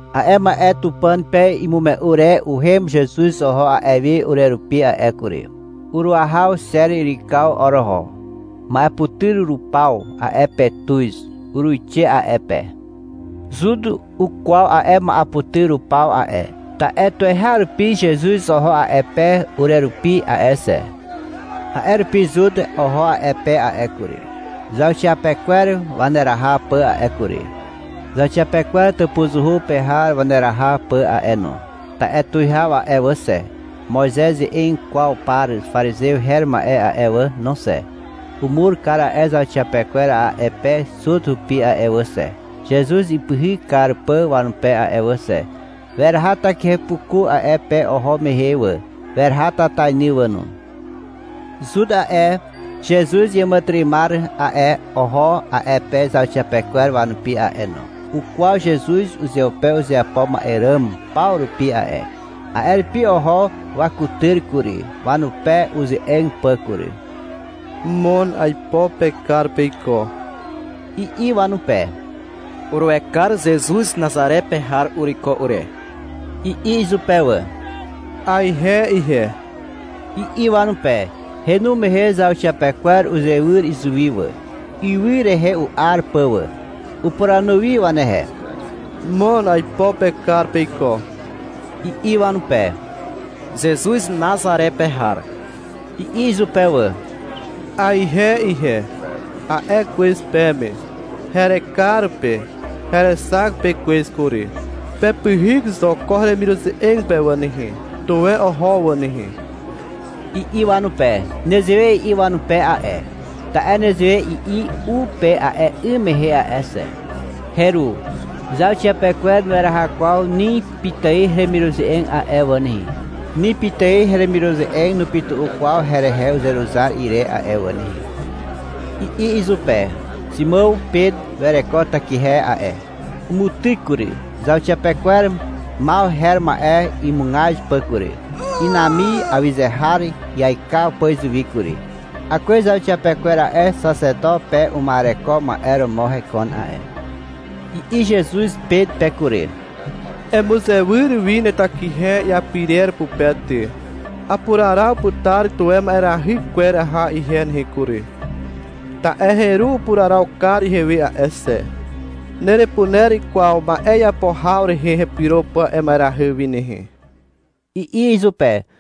A'e ma'e Tupàn pe imume'u re uhem Zezuz oho a'e wi urerupi a'e kury. Uruahaw Xer yrykaw oroho. Ma'eputyr rupaw a'e pe tuz. Uruixe a'e pe. Zut ukwaw a'e ma'eputyr rupaw a'e. Ta'e tuweharupi Zezuz oho a'e pe urerupi a'e xe. A'e rupi Zut oho a'e pe a'e kury, zauxiapekwer waneraha pà a'e kury, zauxiapekwer tàpuzuhu pe har waneraha pà a'e no. Ta'e tuwihaw a'e wà xe, Moizez ze'eg kwaw par parizew her ma'e a'e wà no xe, umur kar a'e zauxiapekwer a'e pe Zut hupi a'e wà xe, Zezuz ipyhyk kar pà wanupe a'e wà xe. Weraha takihepuku a'e pe oho mehe wà, weraha tatainy wà no. Zut a'e, Zezuz iàmàtyry'ymar a'e, oho a'e pe zauxiapekwer wanupi a'e no. Ukwaw Zezuz uzeupe uzeapo ma'e ràm paw rupi a'e. A'e rupi oho wakutyr kury, wanupe uze'eg pà kury. — Mon aipo pekar peiko, i'i wanupe. — Uruekar Zezuz Nazare pe har uruiko ure, i'i izupe wà. — Aihe ihe, i'i wanupe. Henu mehe zauxiapekwer uzewyr izuwi wà, ywy rehe u'ar pà wà. Upuranu wi wanehe. — Mon aipo pekar peiko, i'i wanupe. — Zezuz Nazare pe har, i'i izupe wà. — Aihe ihe, a'e kwez peme. Herekar pe. Herexak pe kwez kury. Pepyhyk zo ko heremiruze'eg pe wà nehe. Tuwe oho wà nehe, i'i wanupe. (Nezewe i'i wanupe a'e, ta'e nezewe i'i u pe a'e 'ym mehe a'e xe.) — Heru, zauxiapekwer nueraha kwaw ni pitài heremiruze'eg a'e wà nehe. Ni pitài heremiruze'eg nupytu'u kwaw herehe uzeruzar ire a'e wà nehe, i'i izupe. Ximàw Pet wereko takihe a'e. Umutyk kury, zauxiapekwer Maw her ma'e imugaz pà kury, inami awyze har iaikaw pà izuwi kury. (Akwez zauxiapekwer a'e, xaxeto pe uma'ereko ma'e romo hekon a'e.) I'i Zezuz Pet pe kury. — Emuzewyr wi netakihe iapirer pupe ty. Apuraraw putar tuwe ma'erahy kwer aha ihe nehe kury, ta'e heru upuraraw kar ihewe a'e xe. Nerepuner kwaw ma'e iapo haw rehe hepyro pà a'e ma'erahy wi nehe, i'i izupe.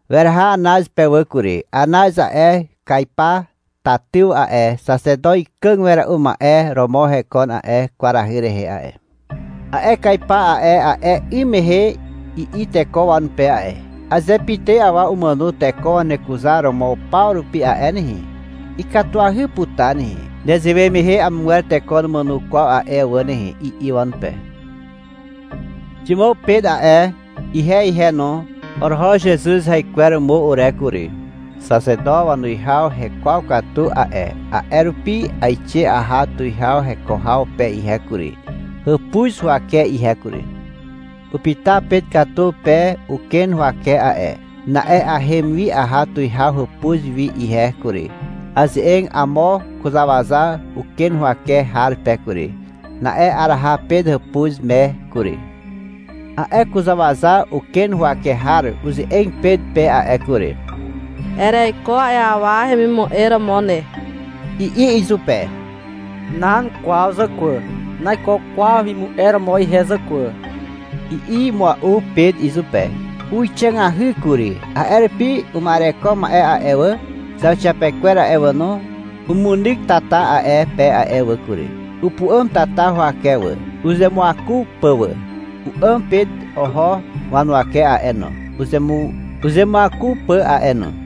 Weraha Anaz pe wà kury. Anaz a'e, Kaipa tatyw a'e, xaxeto ikàg wera'u ma'e romo hekon a'e kwarahy rehe a'e. A'e Kaipa a'e, a'e 'ym mehe i'i teko wanupe a'e. — Aze pitài awa umàno teko wanekuzaromo paw rupi a'e nehe, ikatuahy putar nehe. Nezewe mehe amogwer teko numàno kwaw a'e wà nehe, i'i wanupe. Ximàw Pet a'e, ihe ihe no, oroho Zezuz haikweromo ure kury. Xaxeto wanuwihaw hekwaw katu a'e. A'e rupi aixe aha tuwihaw heko haw pe ihe kury, hàpuz huwake ihe kury. Upyta Pet katu pe uken huwake a'e. Na'e ahem wi aha tuwihaw hàpuz wi ihe kury. Aze'eg amo kuzàwaza uken huwake har pe kury. Na'e araha Pet tàpuz me kury. A'e kuzàwaza uken huwake har uze'eg Pet pe a'e kury. — Ereiko a'e awa hemimu'e romo ne, i'i izupe. — Nan kwaw zàkwà, naiko kwaw hemimu'e romo ihe zàkwà, i'i mua'u Pet izupe. Huwixàgahy kury. A'e rupi uma'ereko ma'e a'e wà, zauxiapekwer a'e wà no, umunyk tata a'e pe a'e wà kury. Upu'àm tata huwake wà, uzemuaku pà wà. U'àm Pet oho wanuwake a'e no, uzemuaku pà a'e no.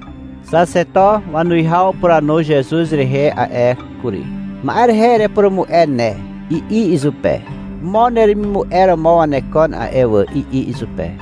Xaxeto wanuwihaw upuranu Zezuz rehe a'e kury. — Ma'e rehe erepurumu'e ne, i'i izupe. — Mo neremimu'e romo wanekon a'e wà, i'i izupe.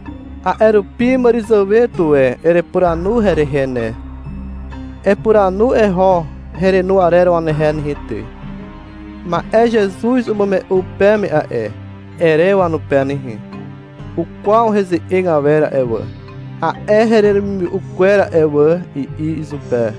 A'e rupi màràzàwe tuwe erepuranu herehe ne. Epuranu eho herenu arer wanehe nehe ty. — Ma'e Zezuz umume'u peme a'e, ere wanupe nehe. Ukwaw heze'eg awer a'e wà, a'e heremimume'u kwer a'e wà, i'i izupe.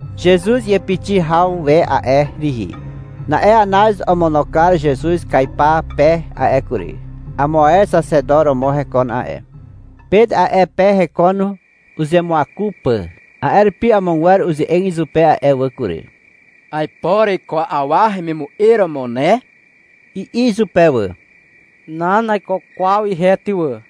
Zezuz iàpixi haw we a'e rihi. Na'e Anaz omono kar Zezuz Kaipa pe a'e kury. Amo ae xaxeto romo hekon a'e. Pet a'e pe hekon uzemuaku pà. A'e rupi amogwer uze'eg izupe a'e wà kury. — Aipo ereiko a'e awa hemimu'e romo ne, i'i izupe wà. — Nan, naiko kwaw ihe ty wà,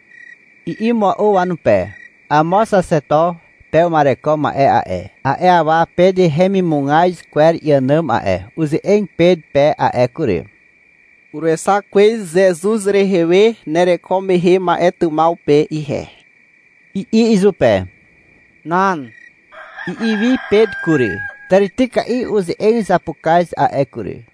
i'i mua'u wanupe. Amo xaxeto pe uma'ereko ma'e a'e, a'e awa Pet hemimugaz kwer iànàm a'e, uze'eg Pet pe a'e kury. — Uruexak kwez Zezuz rehe we nereko mehe ma'e tymaw pe ihe, i'i izupe. — Nan, i'i wi Pet kury. Tàrityka'i uze'eg zapukaz a'e kury.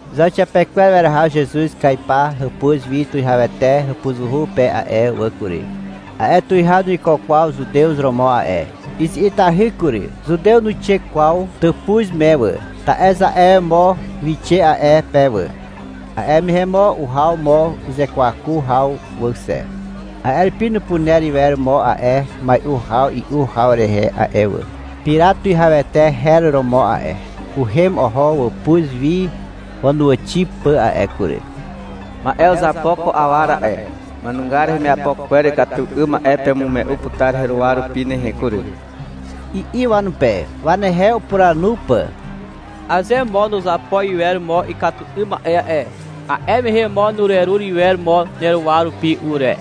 Zauxiapekwer weraha Zezuz Kaipa hàpuz wi tuwihawete hàpuzuhu pe a'e wà kury. A'e tuwihaw nuiko kwaw Zutew romo a'e. Izi'itahy kury. Zutew nuixe kwaw tàpuz me wà, ta'e aze mo wixe a'e pe wà, a'e mehe mo uhaw mo uzekwaku haw wà xe. A'e rupi nupuner iwer mo a'e mai'u haw i'u haw rehe a'e wà. Pirat tuwihawete her romo a'e. Uhem oho wàpuz wi wanuwàxi pà a'e kury. — Ma'e uzapo ko awa ra'e, ma'enugar hemiapo kwer ikatu 'ym ma'e pemume'u putar heruwa rupi nehe kury, i'i wanupe, wanehe upuranu pà. — Aze mo nuzapo iwer mo ikatu 'ym ma'e a'e, a'e mehe mo nurerur iwer mo neruwa rupi ure,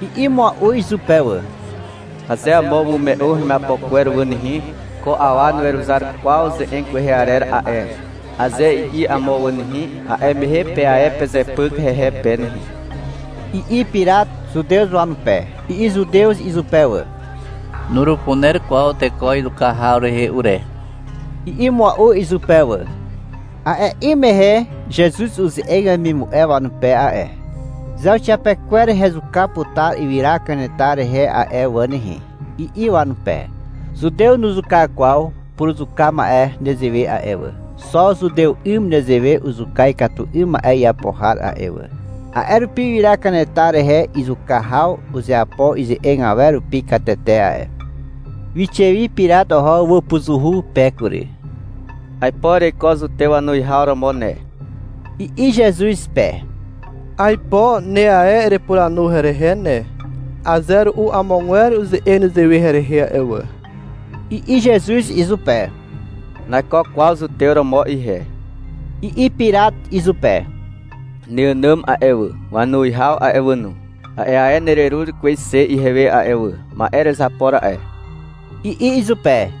i'i mua'u izupe wà. — Aze amo umume'u hemiapo kwer wà nehe, — Ko awa nuweruzar kwaw ze'eg kwehe arer a'e, aze i'i amo wà nehe, a'e mehe pe ae pezepyk hehe pe nehe, i'i Pirat Zutew wanupe. I'i Zutew izupe wà. — Nurupuner kwaw teko izuka haw rehe ure, i'i mua'u izupe wà. (A'e 'ym mehe Zezuz uze'eg wemimu'e wanupe a'e. — Zauxiapekwer hezuka putar ywyra kanetar rehe a'e wà nehe, i'i wanupe. Zutew nuzuka kwaw puruzuka ma'e nezewe a'e wà. Xo Zutew 'ym nezewe uzuka ikatu 'ym ma'e iapo har a'e wà. A'e rupi ywyra kanetar rehe izuka haw uzeapo ize'eg awer rupi katete a'e.) Wixe wi Pirat oho wàpuzuhu pe kury. — Aipo ereiko Zutew wanuwihaw romo ne, i'i Zezuz pe. — Aipo ne ae erepuranu herehe ne. Aze ru'u amogwer uze'eg nezewe herehe a'e wà, i'i Zezuz izupe. — Naiko kwaw zutew romo ihe, i'i Pirat izupe. — Neànàm a'e wà, wanuwihaw a'e wà no, a'e ae nererur kwez xe ihewe a'e wà. Ma'e erezapo ra'e, i'i izupe.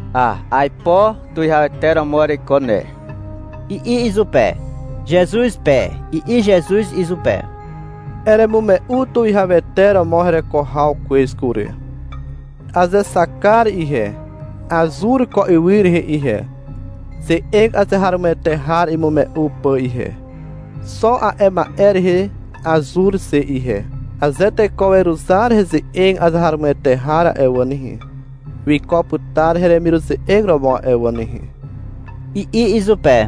— A, aipo tuwihawete romo ereiko ne, i'i izupe, Zezuz pe. I'i Zezuz izupe. — Eremume'u tuwihawete romo hereko haw kwez kury. Azexak kar ihe, azur ko ywy rehe ihe, ze'eg azeharomoete har imume'u pà ihe. Xo a'e ma'e rehe azur xe ihe. Aze teko weruzar heze'eg azeharomoete har a'e wà nehe, wiko putar heremiruze'eg romo a'e wà nehe, i'i izupe.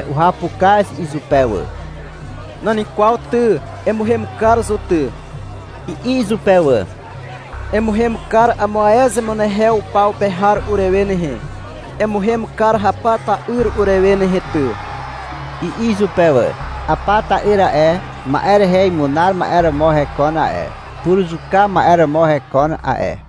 Uhapukaz izupe wà. — Nan kwaw ty, emuhem kar zo ty, i'i izupe wà. — Emuhem kar amo ae zemunehew paw pe har urewe nehe. Emuhem kar Hapa ta'yr urewe nehe ty, i'i izupe wà. (Hapa ta'yr a'e, ma'e rehe imunar ma'e romo hekon a'e, puruzuka ma'e romo hekon a'e.)